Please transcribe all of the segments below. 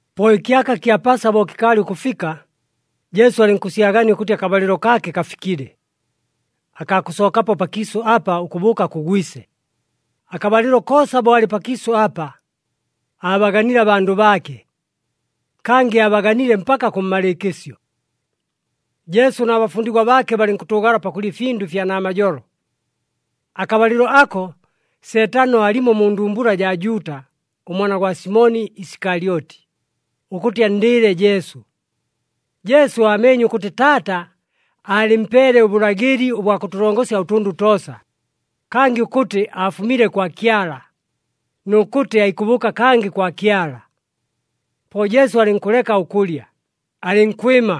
Po ɨkyaka kya Pasa bo kɨkaalɨ ʉkʉfika, Jesu alɨnkʉsyagania ʉkʉtɨ akabalɨlo kaake kafikile, akaa kʉsookapo pakiisʉ apa ʉkʉbʉʉka kʉ Gwise. Akabalɨlo koosa bo alɨ pakiisʉ apa, aabaganile abandʉ baake, kangɨ aabaganile mpaka kʉmmalɨɨkɨsyo. Jesu na bafundigwa baake balɨnkʉtʉʉgala pakʉlya ɨfindʉ ɨfya namajolo. Akabalɨlo ako Seetano aalimo mu ndumbula jaa Juuta ʉmwana gwa Simoni Isikalyoti, ʉkʉtɨ anndɨɨle Jesu. Jesu aameenye ʉkʉtɨ Taata aalɨmpeele ʉbʉlagɨli ʉbwa kʉtʉlongosya ʉtʉndʉ toosa, kangɨ ʉkʉtɨ aafumile kwa Kyala, nʉ kʉtɨ aikʉbʉʉka kangɨ kwa Kyala. Po Jesu alɨnkʉleka ʉkʉlya, alɨnkwɨma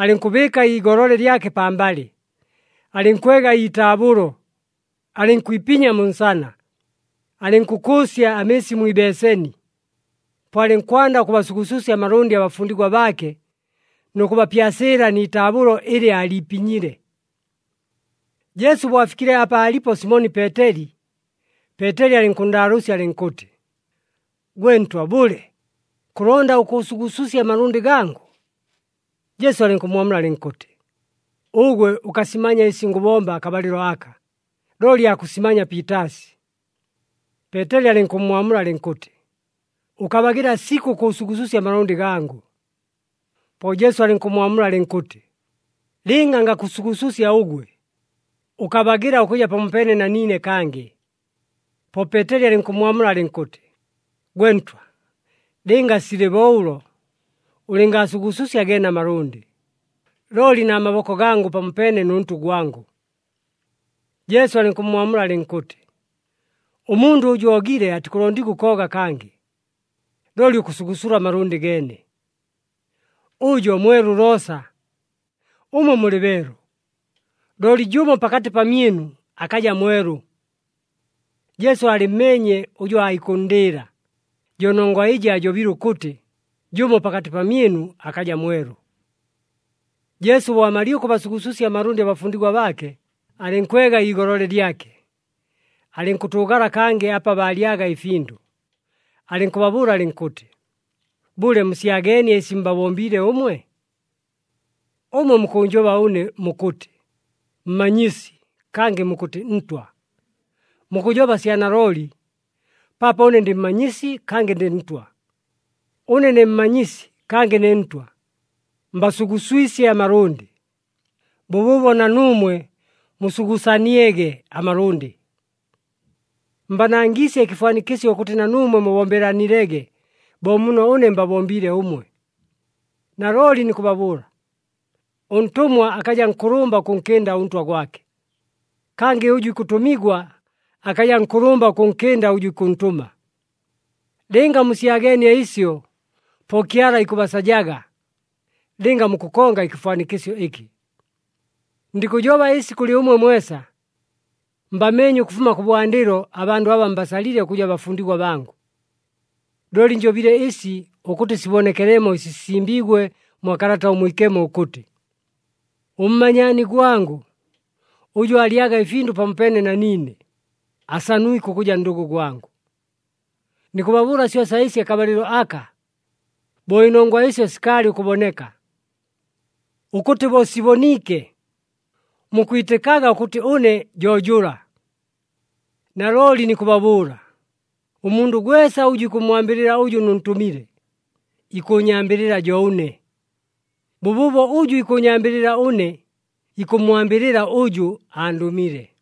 alɨnkʉbɨɨka iigolole lyake pambalɨ, alɨnkwega iitaabʉlo alɨnkwipinya mu nsana. Alɨnkʉkʉʉsya amɨɨsi mwi ibeeseni. Po alɨnkwanda ʉkʉbasugususya amalʉndɨ abafundigwa baake nʉ kʉbapyasɨɨla nɨ taabʉlo ɨlɨ aaliipinyile. Jesu bo afikile apa aalipo Simoni Peeteli, Peeteli alɨnkʉnndaalʉʉsya alɨnkʉtɨ, “Gwe Ntwa bʉle, kʉlonda ʉkʉʉsugususya amalʉndɨ gangʉ?” Jesu alɨnkʉmmwamula alɨnkʉtɨ, “Ʉgwe ʉkasimanya ɨsi ngʉbomba akabalɨlo aka, looli aakʉsimanya piitaasi.” Peeteli alɨnkʉmmwamula alɨnkʉtɨ, “Ʉkabagɨla sikʉ ʉkʉʉsugususya amalʉndɨ gangʉ!” Po Jesu alɨnkʉmmwamula alɨnkʉtɨ, “Lɨnga ngakʉsugususya ʉgwe, ʉkabagɨla ʉkʉja pamopeene na niine kangɨ.” Po Peeteli alɨnkʉmmwamula alɨnkʉtɨ, “Gwe Ntwa, lɨnga silɨ bo ʉlo, ʉlɨngaasugususya geene amalʉndɨ, looli na maboko gangʉ pamopeene nʉ ntʉ gwangʉ.” Jesu alɨnkʉmmwamula alɨnkʉtɨ, “Ʉmundʉ ʉjʉ oogile, atikʉlondigwa ʉkooga kangɨ, looli ʉkʉsugusula amalʉndɨ geene. Ʉjo mwelu loosa. Ʉmwe mulɨ beelu, looli jʉmo pakatɨ pamyɨnu akaja mwelu.” Jesu aalɨmmeenye ʉjʉ aikʉnndɨɨla, jo nongwa ɨjɨ aajobile ʉkʉtɨ, “Jʉmo pakatɨ pamyɨnu akaja mwelu.” Jesu bo amalile ʉkʉbasugususya amalʉndɨ abafundigwa baake, alɨnkwega iigolole lyake, alɨnkʉtʉʉgala kangɨ apa baalyaga ɨfindʉ, alɨnkʉbabʉʉla alɨnkʉtɨ, “Bʉle, musyageenie ɨsi mbabombiile ʉmwe? Ʉmwe mukʉʉnjoba ʉne mukʉtɨ, ‘Mmanyisi,’ kangɨ mukʉtɨ, ‘Ntwa.’ Mukʉjoba sya nalooli, paapo ʉne ndɨ Mmanyisi, kangɨ ndɨ Ntwa. Ʉne ne Mmanyisi, kangɨ ne Ntwa, mbasuguswisye amalʉndɨ. Bʉbʉʉbo na nuumwe musugusaniege amalʉndɨ. Mbanangiisye ɨkɨfwanikɨsyo ʉkʉtɨ na nuumwe mubombelanilege bo muno ʉne mbabombiile ʉmwe. Nalooli nikʉbabʉʉla, ʉntʉmwa akaja nkʉlʉmba ʉkʉnkɨnda ʉntwa gwake, kangɨ ʉjʉ ikʉtʉmigwa akaja nkʉlʉmba ʉkʉnkɨnda ʉjʉ ikʉntʉma. Lɨnga musyaganie ɨsyo, po Kyala ikʉbasajaga lɨnga mukʉkonga ɨkɨfwanikɨsyo ɨkɨ. “Ndikʉjoba ɨsi kʉlɨ ʉmwe mwesa. Mbameenye ʉkʉfuma kʉbwandɨlo abandʉ aba mbasalile ʉkʉja bafundigwa bangʉ. Looli njobile ɨsi ʉkʉtɨ sibonekelemo ɨsi sisimbiigwe mwa Kalata ʉMwikemo ʉkʉtɨ, ‘Ʉmmanyaani gwangʉ ʉjʉ aalyaga ɨfindʉ pamopeene na niine, asanwike ʉkʉja ndʉgʉ gwangʉ.’ Nikʉbabʉʉla syosa ɨsi akabalɨlo aka, bo ɨnongwa ɨsyo sikaalɨ ʉkʉboneka, ʉkʉtɨ bo siboniike, mukwitɨkaga ʉkʉtɨ ʉne jo jʉla. Nalooli nikʉbabʉʉla, ʉmundʉ gwesa ʉjʉ ikʉmmwambɨlɨla ʉjʉ nʉntʉmile, ikʉʉnyambɨlɨla jo ʉne. Bʉbʉʉbo ʉjʉ ikʉʉnyambɨlɨla ʉne, ikʉmmwambɨlɨla ʉjʉ andʉmile.”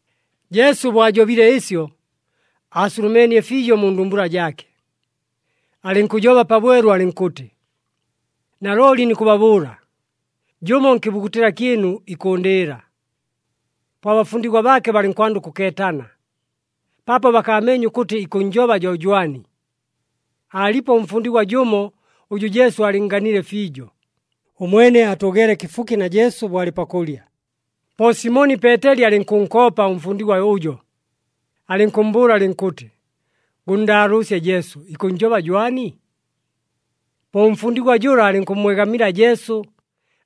Jesu bo ajobile ɨsyo, aasulumeenie fiijo mu ndumbula jaake, alɨnkʉjoba pabwelu alɨnkʉtɨ, “Nalooli nikʉbabʉʉla, jʉmo nkɨbugutɨla kyɨnu, ikʉʉndɨɨla.” Po abafundigwa baake balɨnkwanda ʉkʉkeetana, paapo bakaameenye ʉkʉtɨ ikʉnnjoba jo jwani. Aalipo ʉmfundigwa jʉmo ʉjʉ Jesu aalɨnnganile fiijo. Ʉmwene aatʉʉgeele kɨfuki na Jesu bo alɨ pakʉlya. Po Simoni Peeteli alɨnkʉnkoopa ʉmfundigwa ʉjo, alɨnkʉmmbʉʉla alɨnkʉtɨ, “Gʉnndaalʉʉsye Jesu, ikʉnnjoba jwani?” Po ʉmfundigwa jʉla alɨnkʉmmwegamila Jesu,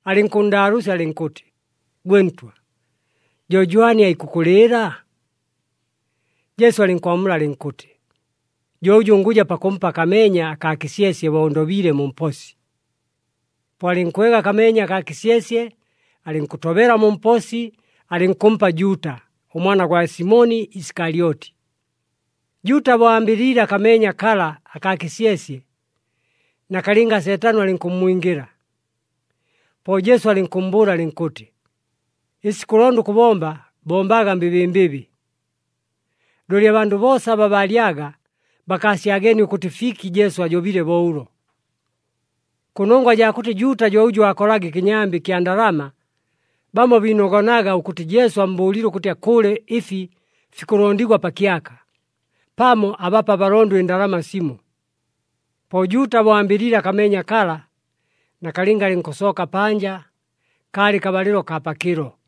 alɨnkʉnndaalʉʉsya alɨnkʉtɨ, “Gwe Ntwa, jo jwani aikʉkʉlɨɨla?” Jesu alɨnkwamula alɨnkʉtɨ, “Jo ʉjʉ ngʉja pakʉmpa akameenya akaa kɨsyesye bo ndobiile mu mposi.” Po alɨnkwega akameenya akaa kɨsyesye, alɨnkʉtobela mu mposi, alɨnkʉmpa Juuta, ʉmwana gwa Simoni Isikalyoti. Juuta bo ambɨliile akameenya kala akaa kɨsyesye, nakalɨnga Seetano alɨnkʉmmwingɨla. Po Jesu alɨnkʉmmbʉʉla alɨnkʉtɨ, “Ɨsi kʉlonda ʉkʉbomba, bombaga mbɨbɨmbɨbɨ!” Looli abandʉ boosa aba baalyaga, bakaasyageenie ʉkʉtɨ fiki Jesu ajobile bo ʉlo. Kʉnongwa jaa kʉtɨ Juuta jo ʉjʉ aakolaga ɨkɨnyambɨ ɨkya ndalama, bamo biinogonaga ʉkʉtɨ Jesu ammbʉʉlile ʉkʉtɨ akʉʉle ɨfi fikʉlondigwa pa kyaka, pamo abape abalondo ɨndalama simo. Po Juuta bo ambɨliile akameenya kala, nakalɨnga alɨnkʉsooka panja. Kaalɨ kabalɨlo kaa pakɨlo.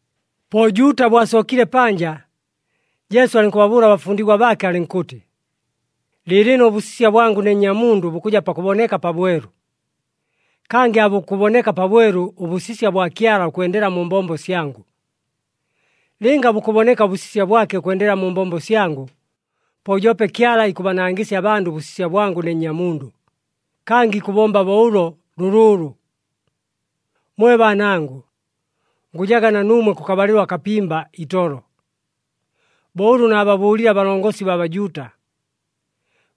Po Juuta bo asookile panja, Jesu alɨnkʉbabʉʉla abafundigwa baake alɨnkʉtɨ, “Lɨɨlɨno ʉbʉsisya bwangʉ ne Nnyamundʉ bukʉja pakʉboneka pabwelu. Kangɨ aabukʉboneka pabwelu ʉbʉsisya bwa Kyala ʉkwendela mu mbombo syangʉ. Lɨnga bukʉboneka ʉbʉsisya bwake ʉkwendela mu mbombo syangʉ, po joope Kyala ikʉbanangɨsya abandʉ ʉbʉsisya bwangʉ ne Nnyamundʉ, kangɨ ikʉbomba bo ʉlo lʉlʉʉlʉ. “Mwe baanangʉ, ngʉjaga na nuumwe kʉkabalɨlo akapimba itolo. Bo ʉlʉ naababʉʉlile abalongosi baa Bajuuta,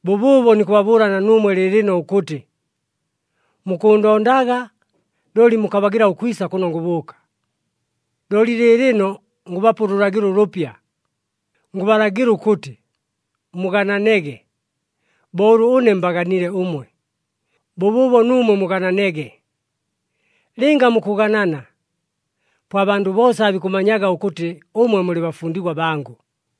bʉbʉʉbo nikʉbabʉʉla na nuumwe lɨɨlɨno ʉkʉtɨ, mukʉʉndondaga looli mukabagɨla ʉkwisa kʉno ngʉbʉʉka. Looli lɨɨlɨno ngʉbapa ʉlʉlagɨlo ʉlʉpya, ngʉbalagɨla ʉkʉtɨ, ‘Mugananege. Bo ʉlʉ ʉne mbaganile ʉmwe, bʉbʉʉbo nuumwe mugananege.’ Lɨnga mukʉganana, po abandʉ boosa aabikʉmanyaga ʉkʉtɨ ʉmwe mulɨ bafundigwa bangʉ.”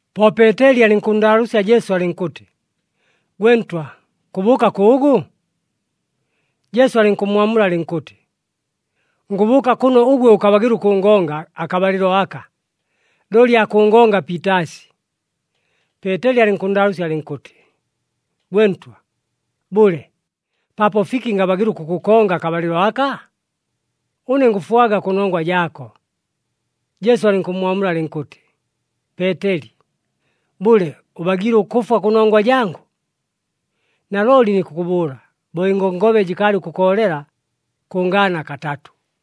Po Peeteli alɨnkʉnndaalʉʉsya Jesu alɨnkʉtɨ, “Gwe Ntwa, kʉbʉʉka kʉʉgʉ?” Jesu alɨnkʉmmwamula alɨnkʉtɨ, “Ngʉbʉʉka kʉno ʉgwe ʉkabagɨla ʉkʉngonga akabalɨlo aka, looli aakʉngonga piitaasi.” Peeteli alɨnkʉnndaalʉʉsya alɨnkʉtɨ, “Gwe Ntwa, bʉle, paapo fiki ngabagɨla ʉkʉkʉkonga akabalɨlo aka? Ʉne ngʉfwaga kʉnongwa jaako!” Jesu alɨnkʉmmwamula alɨnkʉtɨ, “Peeteli, bʉle ʉbagiile ʉkʉfwa kʉnongwa jangʉ? Nalooli nikʉkʉbʉʉla, bo ɨngongobe jɨkaalɨ ʉkʉkoolela, kʉngaana katatʉ.”